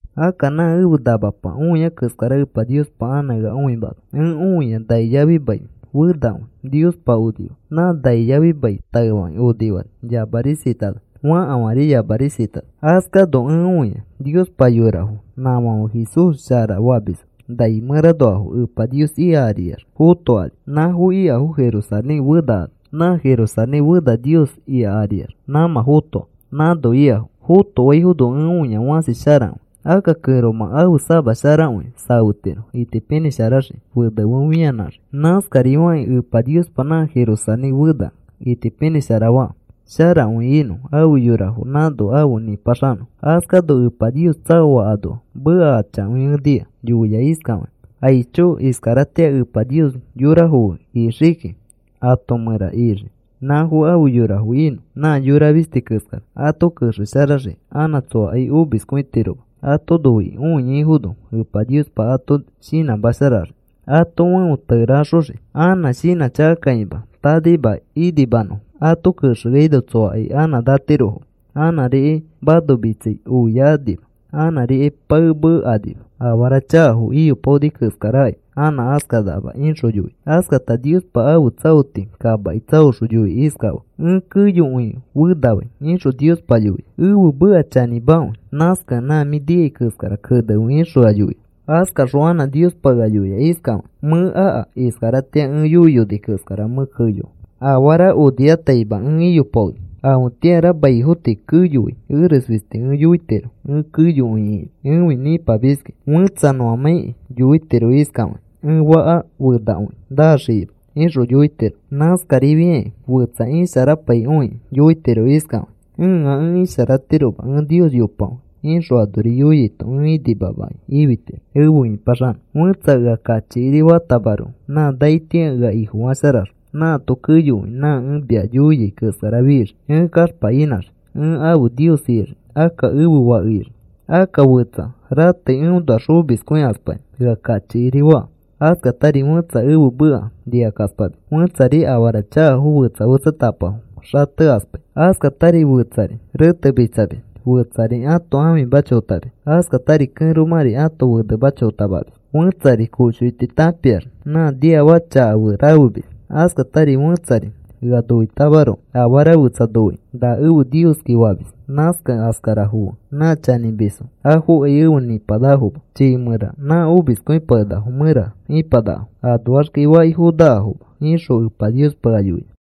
Akka nã ẽfe namapa õia keskara Epa Niospa anã ea õimana. Ẽ õia nai yafi mai fenakõi Niospa onifaa. Nã nai yafi mai taefakĩ onifani yamarisatana. Fakafãri yamarisatana. Askano ẽ õia Niospa yorafo nãfãfe Jesús Ifo shara famisfo nai mẽranoafo Epa Nios ika ariax fotokani. Nãfo ikafo Jerusalén fena ano. Nã Jerusalén fena Nios ika ariax nãmã fotoa nãno ikafo. Fotoaifono ẽ õia fãsi sharakõi. Akka kẽromã ãfe sama sharakõi safetiro itipinĩsharaxikĩ fene fe fianãxiki. Nãskari fakĩ Epa Niospa nã Jerusalén fena itipinĩshara faa sharakõi inõ afe yorafo nãno afe nĩpaxanõfo. Askano Epa Nios tsaoa anoa meka achakõi ẽ nika. Yoia iskafakĩ: “¡Aicho! Iskaratĩa Epa Nios yorafo fe ixikiki. Ato mẽra ixii nãfo afe yorafo inõ, nã yora fisti keskara. Ato kexesharaxii anã tsoakai omiskõitiroma. Ato noikĩ oiaifono Epa Niospa ato shinãmasharaxii ãto fẽo tereaxoxii anã shinãchakakakima tanaima inimanõfo. Ato kexeaino tsoakai anã natiroma, anãrikai manomitsai oiakanima, anãrikai paemekanima. Afara chakafo iyopaoni keskarakai anã askanakama,” ixõ yoia. Askata Niospa ãfe tsaoti kamaki tsaoxõ yoikĩ iskafaa: “Ẽ keyokõi fenafai,” ixõ Niospa yoia. “Ẽfe meka chanĩmakõi. Nãskakẽ nã mĩ nikai keskara kenefe,” ixõ ea yoia. Askaxõ anã Niospa ea yoia iskafakĩ: “Mẽ aka. Iskaratĩa ẽ yoiyoni keskara mẽ keyoa. Afara onifataima ẽ iyopaoni. Afetĩara maifo tii keyoai eres fisti ẽ yoitiro. Ẽ keyokõi ĩkinã. Ẽfi nĩpamiski. Fetsa nõamãikĩ yoitiro iskafakĩ: ‘Ẽ faka fenakõi naxikima,’ ixõ yoitiro. Nãskarifiai fetsa ipaisharapaikõikĩ yoitiro iskafakĩ: ‘Ẽa ẽ isharatiroma. Ẽ Nios yopakõi,’ ixõ anori yoiaito ẽ inimakĩ ifitiro, efe ĩpaxanõ. Fẽtsa ea kachikiri fatamaroko nã naitĩa ea Ifofasharaxõ nãato keyokõi nã ẽ mia yoia keskara fixii. Ẽ kaxpa inãxii. Ẽ ãfe Nios ixii. Akka ẽfe fake ixii. Akka fetsa ratei eõnoax omiskõikaspakĩ ea kachikiri faa, askatari fẽtsa ẽfe meka nikakaspamis, fẽtsari afara chakafo fetsa fetsatapafo xatekaspai, askatari fetsari retemitsamis, fetsari ãto ãfima chotamis, askatari kẽromãri ãto fenema chotamamis, fẽtsari koshoiti tãpiax nã niafaka chakafo fe rafemis, askatari fẽtsari ea noitamaroko afara fetsa noikĩ, ‘Na ẽfe nioski,’ famis. Nãskakẽ askarafo fe nã chanĩmisfo afokai efe nĩpanakafoma. Chiifã mẽra nã omiskõipakenakafo mẽra ipanakafo. Anoaxkai faki fonakafoma,” ixõ Epa Niospa ea yoia.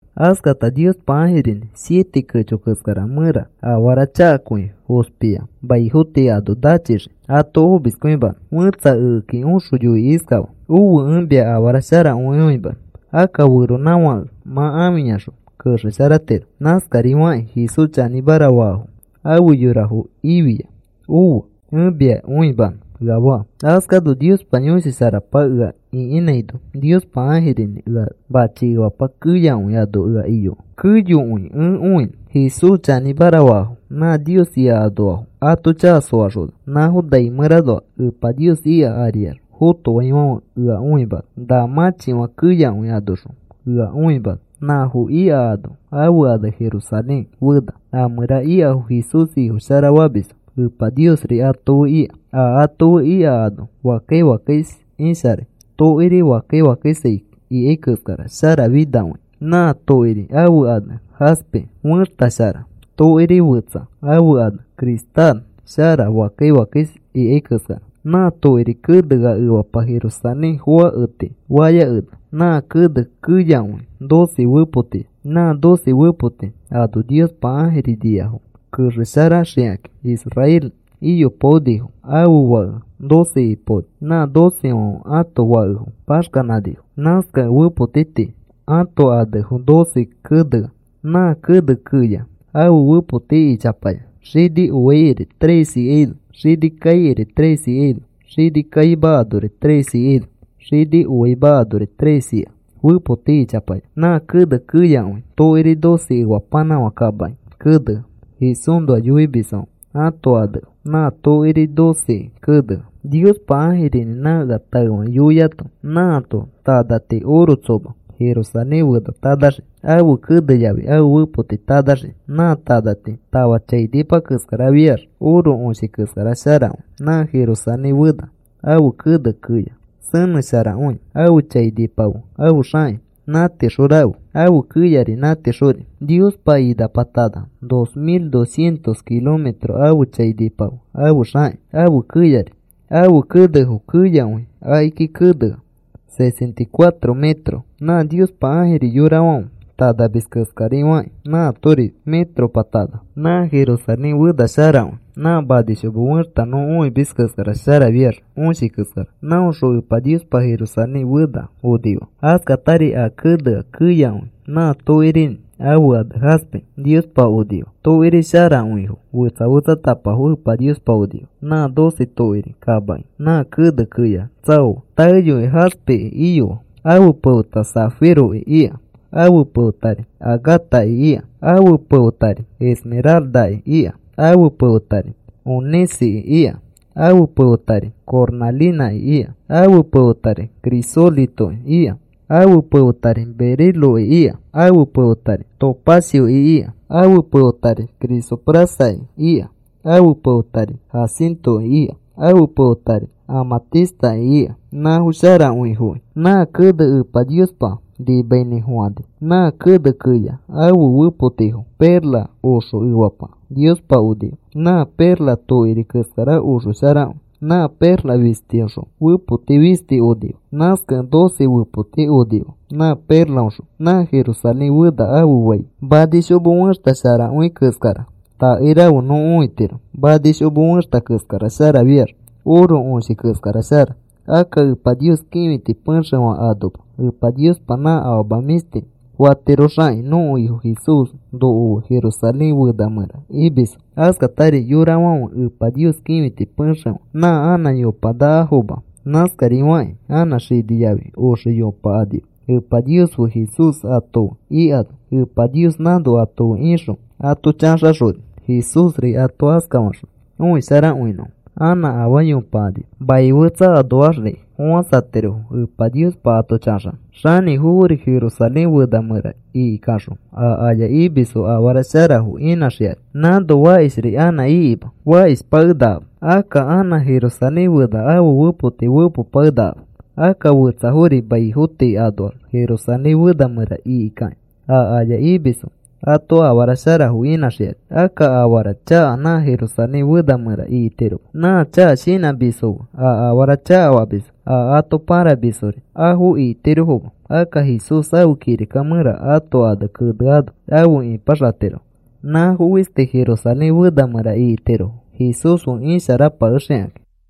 Askata Niospa ãjirinĩ siete kecho keskara mẽra afara chakakõi fospia maifo tii ano nachixii ato omiskõimanõ fẽtsa ekeki oxõ yoikĩ iskafaa: “¡Ofe! Ẽ mia afara sharakõi õimanõ. Akka feronãfãke mã ãfiyaxõ kexesharatiro. Nãskarifakĩ Jesús chanĩmara faafo afe yorafo ifia. Ofe. Ẽ mia õimanõ,” ea faa. Askano Niospa Yõshi Sharapa ea ĩkinãino Niospa ãjirinĩ ea machi efapa keyakõi ano ea iyoa keyokõi ẽ õinõ. Jesús chanĩmara faafo nã Nios ika anoafo ato chaka soaxona nãfo nai mẽranoa Epa Nios ika ariax fotoaifãfe ea õimana. Na mãchifã keyakõi anoxõ ea õimana. Nãfo ika ano ãfe ane Jerusalén Fena. A mẽra ikafo Jesús Ifo shara famisfo. Epa Niosri ato fe ika. A ato fe ika ano fakkai fakkais isharai. Tokiri fakkai fakkais ikai keskara sharafinakõia. Nã tokiri ãfe ane jaspe fẽxta shara, tokiri fetsa ãfe ane cristal. Shara fakkai fakkais ikai keskara. Nã tokiri kenea efapa Jerusalén foake tii fayakena. Nã kene keyakõi doce fepotiya. Nã doce fepoti ano Niospa ãjiri niafo kexesharaxikakĩ. Israel iyopaonito ãfe fake doce ipaoni. Nã docefãfe ãto fakefo paxkanifo. Nãskakẽ fepoti tii ãto anefo doce kenea. Nã kene keya ãfe fepoti ichapaya. Xini oaikiri tres ikaino, xini kaikiri tres ikaino, xini kaima anori tres ikaino, xini oaima anori tres ika fepoti ichapaya. Nã kene keyakõi tokiri doce efapanãfã kamaki kenea. Jesúsnoa yoimisfãfe ãto anefo nã tokiri doceki kenea. Niospa ãjirinĩ nã ea taefakĩ yoiato, nãato tanati oro tsoma, Jerusalén Fena tanaxii, ãfe kene yafi ãfe fepoti tanaxiki. Nã tanati tafa chainipa keskarafiax oro õshi keskara sharakõi. Nã Jerusalén Fena ãfe kene keya senẽsharakõi. Ãfe chainipa fe ãfe xãkĩ nãtixõ rafe. Ãfe keyari nãtixori. Niospa inapa tana dos mil dos cientos kilometro ãfe chainipa fe, ãfe xãkĩ, ãfe keyari. Ãfe kenefo keyakõi a akiki kenea sesenta y cuatro metros. Nã Niospa ãjiri yorafãfe tanamis keskari fakĩ nãatori metropa tana. Nã Jerusalén Fena sharakõi. Nã manishomo fẽxta nõ õimis keskara sharafiax õshi keskara. Nãõxõ Epa Niospa Jerusalén Fena onifaa. Askatari a kenea keyakõi nã tokirinĩ ãfe ane jaspe Niospa onifaa. Tokiri sharakõifo fetsa fetsatapafo Epa Niospa onifaa, nã doce tokiri kamaki nã kene keya tsaoa. Taeyoi jaspeki iyoa. Ãfe pefeta zafiroki ika. Ãfe pefetari agataki ika, ãfe pefetari esmeraldaki ika, ãfe pefetari onĩceki ika, ãfe pefetari cornãlinãki ika, ãfe pefetari crisolitoki ika, ãfe pefetari beriloki ika, ãfe pefetari topacioki ika, ãfe pefetari crisoprasaki ika, ãfe pefetari jacintoki ika, ãfe pefetari amãtistaki ika; nãfo sharakõifoki nã kene Epa Niospa nimainĩfofãni. Nã kene keyapa ãfe fepotifo perla oxo efapa Niospa onifaa. Nã perla tokiri keskara oxo sharakõi. Nã perla fistiõxõ fepoti fisti onifaa. Nãskakẽ doce fepoti onifaa nã perlaoxõ. Nã Jerusalén Fena ãfe fai manishomo fẽxta sharakõi keskara oke rafe nõ õitiro. Manishomo fẽxta keskara sharafiax oro õshi keskara shara. Akka Epa Nios kĩfiti pexefã anoma. Epa Niospa nã afama mĩshti fatiroxakĩ nõko Ifo Jesús noko fe Jerusalén Fena mẽra imisfo. Askatari yorafãfe Epa Nios kĩfiti pexefã nã anã yopanakafoma. Nãskarifakĩ anã xini yafi oxe yopakanima Epa Nios fe Jesús ato fe ikano. Epa Nios nãno ato fe ixõ ato chaxaxoni. Jesúsri ato askafaxõi õisharakõinõfo. Anã afaa yopakanima. Mai fetsa anoaxri fofãsatirofo Epa Niospa ato chãxano. Xanĩfofori Jerusalén Fena mẽra ikikaxõ a aya imisfo afara sharafo inãxikani. Nãno fakishri anã ikima. Fakishpakenakama. Akka anã Jerusalén Fena ãfe fepotifo fepopakenakama. Akka fetsafori maifo tii anoax Jerusalén Fena mẽra ikikakĩ a aya imisfo ato afara sharafo inãxikani. Akka afara chaka nã Jerusalén Fena mẽra ikitiroma. Nã chaka shinãmisfo fe a afara chakafamisfo, a ato pãramisfori afo ikitirofoma. Akka Jesús ãfe kirika mẽra ãto ane keneano afe ipaxatirofo. Nãfo fisti Jerusalén Fena mẽra ikitirofo Jesús fe ipasharaxikakĩ.